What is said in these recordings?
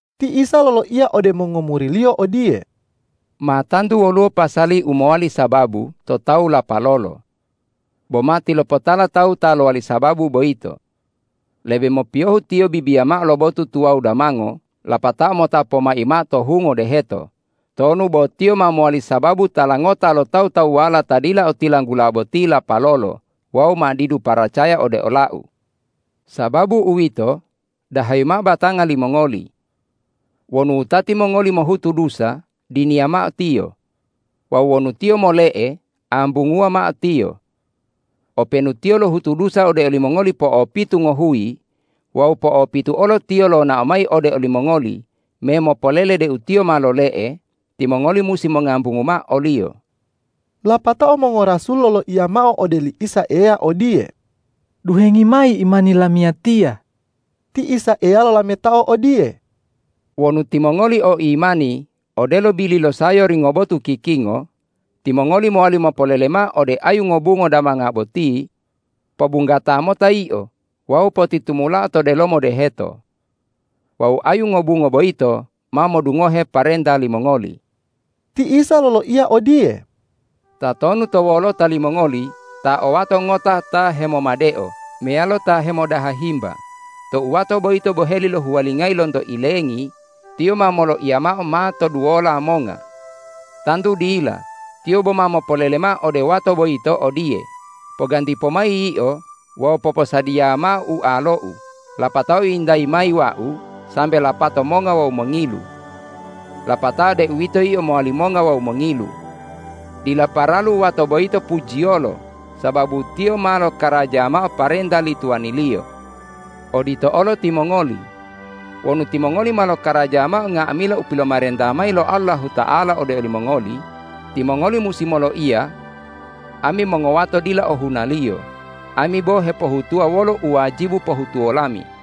Ti Isa loloiya ode mongomuri-Liyo odiye,”Ma tantu woluwo pasali u mowali sababu to tawu lapalolo. Bo matilopotala tawu ta lowali sababu boyito! Lebe mopiyohu tiyo bibiya mao lo botu tuwawu damango lapatao mota pomai mao to hungo deheto, tonu bo tiyo ma mowali sababu tala ngota lo tawu-tawuwala ta dila otilanggula boti lapalolo wawu ma didu paracaya ode ola-U. Sababu uwito, dahayi mao batanga limongoli! Wonu wutati mongoli mohutu dusa, diniya mao tiyo; wawu wonu tiyo mole'e, ambunguwa mao tiyo. Openu tiyo lohutu dusa ode olimongoli po'opitu ngohuyi wawu po'opitu olo tiyo lonao mayi ode olimongoli me mopolele deu tiyo ma lole'e, timongoli musi mongambungu mao oliyo.” Lapatao mongorasul loloiya mao ode oli Isa Eya odiye,”Duhengi mayi imani lamiyatiya!” Ti Isa Eya lolametao odiye,”Wonu timongoli o imani odelo bili lo sayori ngobotu kikingo, timongoli mowali mopolele mao ode ayu ngobungo damanga boti: Pobunggata mota yio wawu potitumulao to delomo deheto! Wawu ayu ngobungo boyito ma modungohe parenta limongoli.” Ti Isa loloiya odiye,”Tatonu to wolota limongoli ta o wato ngota ta hemomadeo meyalo ta hemodaha himba, tou wato boyito boheli lohuwalingayi lonto ilengi, tiyo ma moloiya mao ma toduwola monga? Tantu dila, tiyo boma mopolele mao ode wato boyito odiye, ’Poganti pomayi yio wawu poposadiya mao ualou lapatao yintayi mayi wau sambe lapato monga wawu mongilu.’ Lapatao deuwito yio mowali monga wawu mongilu. Dila paralu wato boyito pujiyolo sababu tiyo ma lokaraja mao parenta li tuwaniliyo. Odito olo timongoli. Wonu timongoli ma lokaraja mao nga'amila u pilomarenta mayi lo Allahuta'ala ode olimongoli, timongoli musi moloiya, ’Ami mongowato dila ohunaliyo. Ami bo hepohutuwa wolo u wajibu pohutuwo lami.’”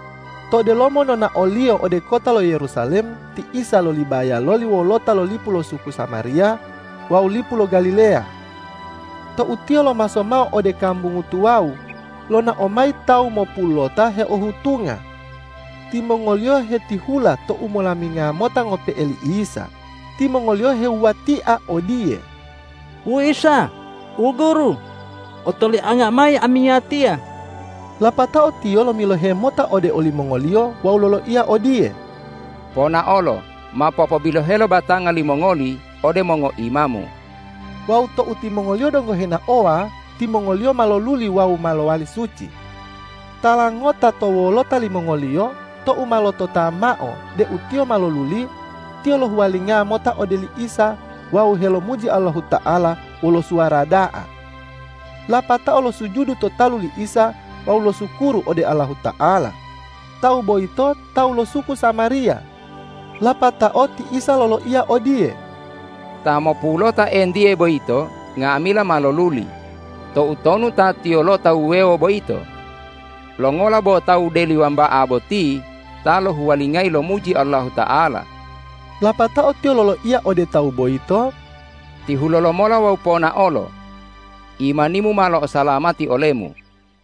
To delomo nonao-Liyo ode kota lo Yerusalem ti Isa lolibaya loli wolota lo lipu lo suku Samariya wawu lipu lo Galileya. Tou Tiyo lomaso mao ode kambungu tuwawu, lonao mayi tawu mopulota heohutunga. Timongoliyo hetihula to umolaminga mota ngope'e li Isa. Timongoliyo hewuwatia odiye,”Wu Isa, wu Guru, otolianga mayi amiyatiya!” Lapatao Tiyo lomilohe mota ode olimongoliyo wawu loloiya odiye,”Ponaolo, mao popobilohelo batanga limongoli ode mongoimamu.” Wawu tou timongoliyo donggo henaowa, timongoliyo ma loluli wawu ma lowali suci. Tala ngota to wolota limongoliyo, tou ma lotota mao deu tiyo ma loluli, tiyo lohuwalinga mota ode li Isa wawu helomuji Allahuta'ala wolo suwara da'a. Lapatao losujudu to talu li Isa wawu losukuru ode Allahuta'ala. Tawu boyito tawu lo suku Samariya. Lapatao ti Isa loloiya odiye,”Ta mopulota entiye boyito nga'amila ma loluli. Toutonu ta tiyolota wuwewo boyito? Longola bo tawu deli wamba'a boti ta lohuwalingayi lomuji Allahuta'ala?” Lapatao Tiyo loloiya ode tawu boyito,”Tihulo lomola wawu ponaolo. Imanimu ma lo'osalamati olemu.”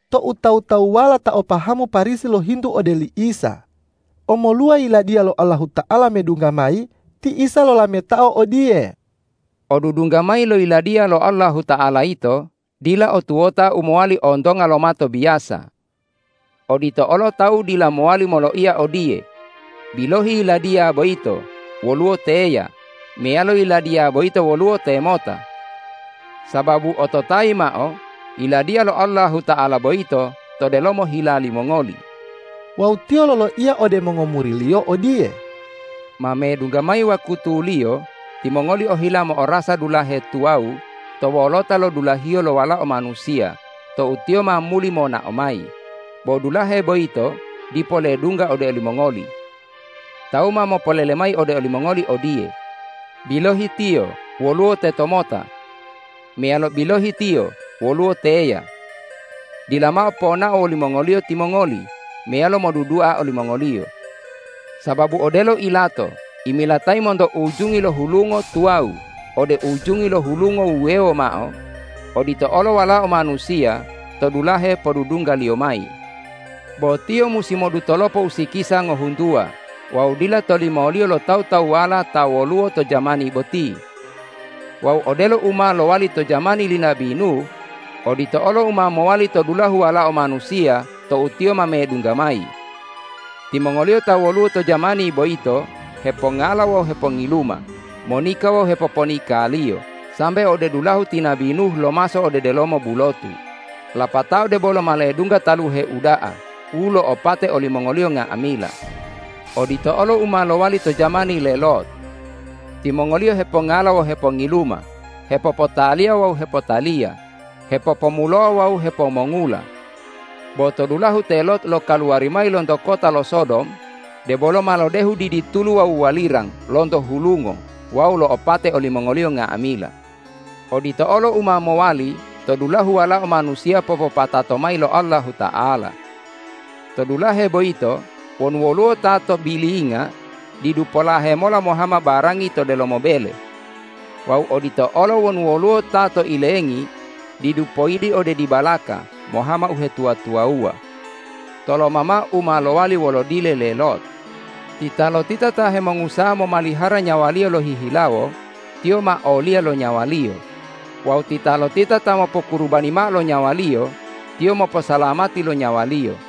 Tou tawu-tawuwala ta o pahamu Parisi lohintu ode li Isa, omoluwa Yiladiya lo Allahuta'ala medungga mayi, ti Isa lolametao odiye,”Odudungga mayi lo Yiladiya lo Allahuta'ala yito dila o tuwota u mowali ontonga lo mato biyasa. Odito olo tawu dila mowali moloiya odiye, bilohi yiladiya boyito woluwo teya! Meyalo, yiladya boyito woluwo temota! Sababu ototayi mao: Yiladiya lo Allahuta'ala boyito to delomo hila limongoli.” Wawu Tiyo loloiya ode mongomuri-Liyo odiye,”Ma medungga mayi wakutuliyo timongoli ohila mo'orasa dulahe tuwawu to wolota lo dulahiyo lo Walao Manusiya tou Tiyo ma muli monao mayi, bo dulahe boyito dipo ledungga ode olimongoli. Tawu ma mopolele mayi ode olimongoli odiye, bilohi Tiyo woluwo tetomota! Meyalo, bilohi Tiyo woluwo teya! Dila mao ponao wolimongoliyo timongoli meyalo modudua olimongoliyo. Sababu odelo ilato imilatayi monto ujungi lo hulungo tuwawu ode ujungi lo hulungo wuwewo mao, odito olo Walao Manusiya to dulahe podudungga-Liyo mayi. Bo Tiyo musi modutolopo usikisa ngohuntuwa wawu dila tolimoliyo lo tawu-tawuwala ta woluwo to jamani boti. Wawu odelo u ma lowali to jamani li nabi Nuh, odito olo u ma mowali to dulahu Walao Manusiya tou Tiyo ma medungga mayi. Timongoliyo ta woluwo to jamani boyito hepongala wawu hepongiluma, monika wawu hepoponikaliyo sambe ode dulahu ti nabi Nuh lomaso ode delomo bulotu, lapatao debolo ma ledungga taluhe uda'a u lo'opate olimongoliyo nga'amila. Odito olo u ma lowali to jamani le Lot. Timongoliyo hepongala wawu hepongiluma, hepopotaliya wawu hepotaliya, hepopomulowa wawu hepomongula. Bo to dulahu te Lot lokaluwari mayi lonto kota lo Sodom, debolo ma lodehu didi tulu wawu walirang lonto hulungo wawu lo'opate olimongoliyo nga'amila. Odito olo u ma mowali to dulahu Walao Manusiya popopatato mayi lo Allahuta'ala. To dulahe boyito wonu woluwo ta to bilinga, didu polahe mola mohama barangi to delomo bele. Wawu odito olo wonu woluwo ta to ilengi, didu poyili ode dibalaka mohama uhetuwa-tuwawuwa. Toloma mao u ma lowali wolo dile le Lot! Titalotita ta hemongusaha momalihara nyawaliyo lohihilawo, tiyo ma oliya lo nyawaliyo; wawu titalotita ta mopokurubani mao lo nyawaliyo, tiyo moposalamati lo nyawaliyo.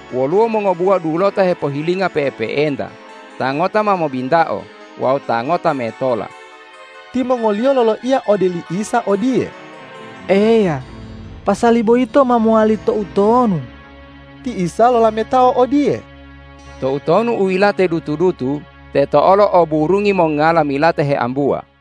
Woluwo mongobuwa dulota hepohilinga pe'epe'enta, ta ngota ma mobintao wawu ta ngota metola.” Timongoliyo loloiya ode li Isa odiye,”Eya, pasali boyito ma mowali toutonu?” Ti Isa lolametao odiye,”Toutonu u yilate dutu-dutu, teto olo o burungi mongala milate heambuwa.”